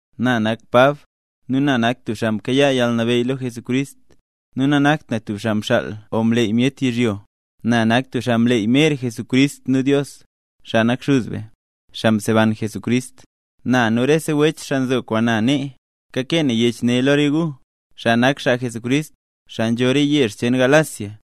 Na nak Pab, nu nak na tub xaa mkayaa yalnabeyy lo Jesucrist, nu nanakt na tub xaa mxaal o mleey myet yizhyo. Na nak tub xaa mleey mer Jesucrist nu Dios, xaa nak Xuz be, xaa mseban Jesucrist. Na, nu rese wech xaa nzo kwaan na nee, kakee na yech ne lo re gu, xaa nak xaa Jesucrist, xaa nzho re yezh cheen Galacia.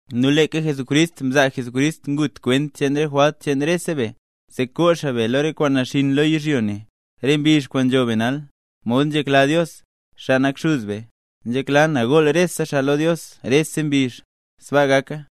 Nu leeka Jesucrist mzaa Jesucrist ngut kwent cheen re jwalt cheen rese be, zee koo xaa be lo re kwaan naxinn lo yizhyo ne, re mbizh kwaan nzho be nal, mod nzhekla Dios, xaa nak Xuz be. ¡Nzhekla na gool rese xaa lo Dios rese mbizh! ¡Sbaa gaka!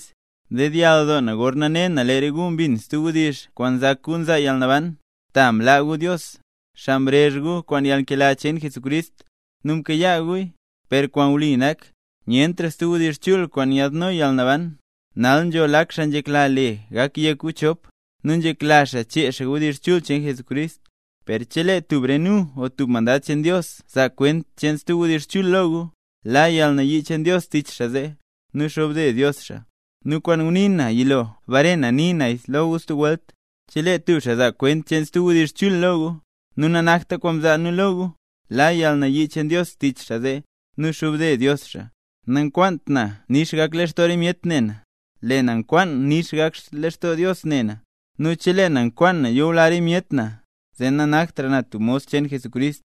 Mdedyall doo na gorna ne na lee re gu mbin stub wdizh kwaan nzak gu nzaa yalnaban, ta mlaa gu Dios, xaa mrezh gu kwaan yalnkela cheen Jesucrist, nu mkayaa guya. Per kwaan wli nak, nyentra stub wdizh chul kwaan nyaadno yalnaban. Nal nzho lak xaa nzhekla le yek gu chop nu nzhekla xaa chee xaa wdizh chul cheen Jesucrist. Per chelee tub re nu o tub mandad cheen Dios zaa kwent cheen stub wdizh chul lo gu, la yalnayii cheen Dios tich xaa zee, nu xobde Dios xaa. Nu kwaan ngunii nu yilo bare na nii naya lo gu stub welt: Chelee tub xaa zaa kwent stub wdizh chul lo gu, nu nanakta kwaan mzaa nu lo gu, la yalnayii cheen Dios tich xaa zee, nu xobde Dios xaa. Nankwaant na nix gak lextoo re myet ne na, lee na nkwaan gak nix lextoo Dios ne na. ¡Nu chelee na nkwaan na yula re myet na, zee nanaktra na tub mos cheen Jesucrist!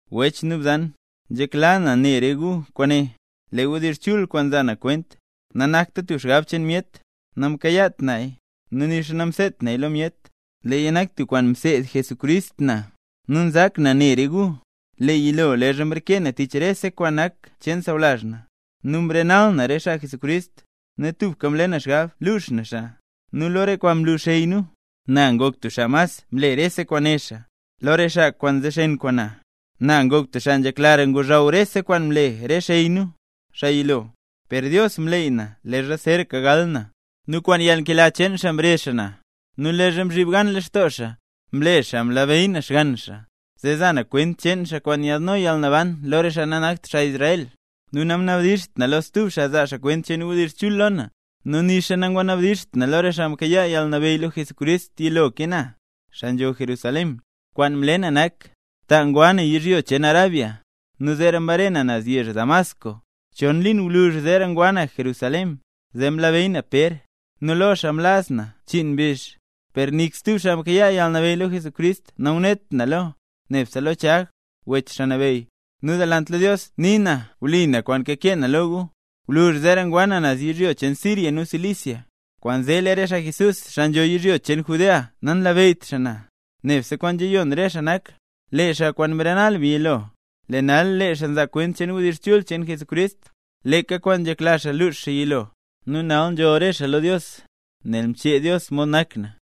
Wech nu bzan, nzhekla na ne re gu kwaane: Lee wdizh chul kwaan nza na kwent, nanakta tub xgab cheen myet. Namkayaat naya, nu nixa namseedt naya lo myet, leeya nak tub kwaan mseed Jesucrist na. Nu nzak na ne re gu, lee yilo leezha mreke na tich rese kwaan nak cheen sawlazh na, nu mrenal na re xaa Jesucrist, nu tubka mle na xgab lux na xaa. Nu lo re kwaan mlu xey nu, na ngok tub xaa mas mle rese kwaan né xaa; lo re xaa kwaan nzexen kwaan na, na ngok tub xaa nzheklara ngozhaw rese kwaan mle re xey nu, xaa yilo. Per Dios mleey na leezha zeeraka gal na, nu kwaan yalnkela cheen xaa mrezh xaa na. Nu leezha mzhib gan lextoo xaa, mle xaa mlabeyy na Xgann xaa, zee za na kwent cheen xaa kwaan nyalno yalnaban lo re xaa nanakt xaa Israel. Nu namnabdizht na lo stub xaa zaa kwent cheen wdizh chul lo na; nu nixa nangwanabdizht na lo re xaa mkayaa yalnabeyy lo Jesucrist yilo ke na, xaa nzho Jerusalén. Kwaan mle na nak, ta ngwa na yizhyo cheen Arabia, nu zeera mbare na naz yezh Damasco. Chon liin gwluzh zeera ngwa na Jerusalén, zee mlabeyy na Pér, nu lo xaa mlaz na chiin mbizh. Per nik stub xaa mkayaa yalnabeyy lo Jesucrist nangunet na lo, nebse lo Chag, wech Xaa Nabeyy. Nu delant lo Dios nii na wli na kwaan kakee na lo gu. Gwluzh zeera ngwa na naz yizhyo cheen Siria nu Cilicia. Kwaanzee lee re xaa Jesús, xaa nzho yizhyo cheen Judea nanlabeyyt xaa na. Nebse kwaan nzhayon re xaa ne nak: “Lee xaa kwaan mrenal be yilo, lee nal nzaa xaa kwent cheen wdizh chul cheen Jesucrist, leeka kwaan nzhekla xaa luux yilo”. Nu nal nzholl re xaa lo Dios, nel mchee Dios mod nak na.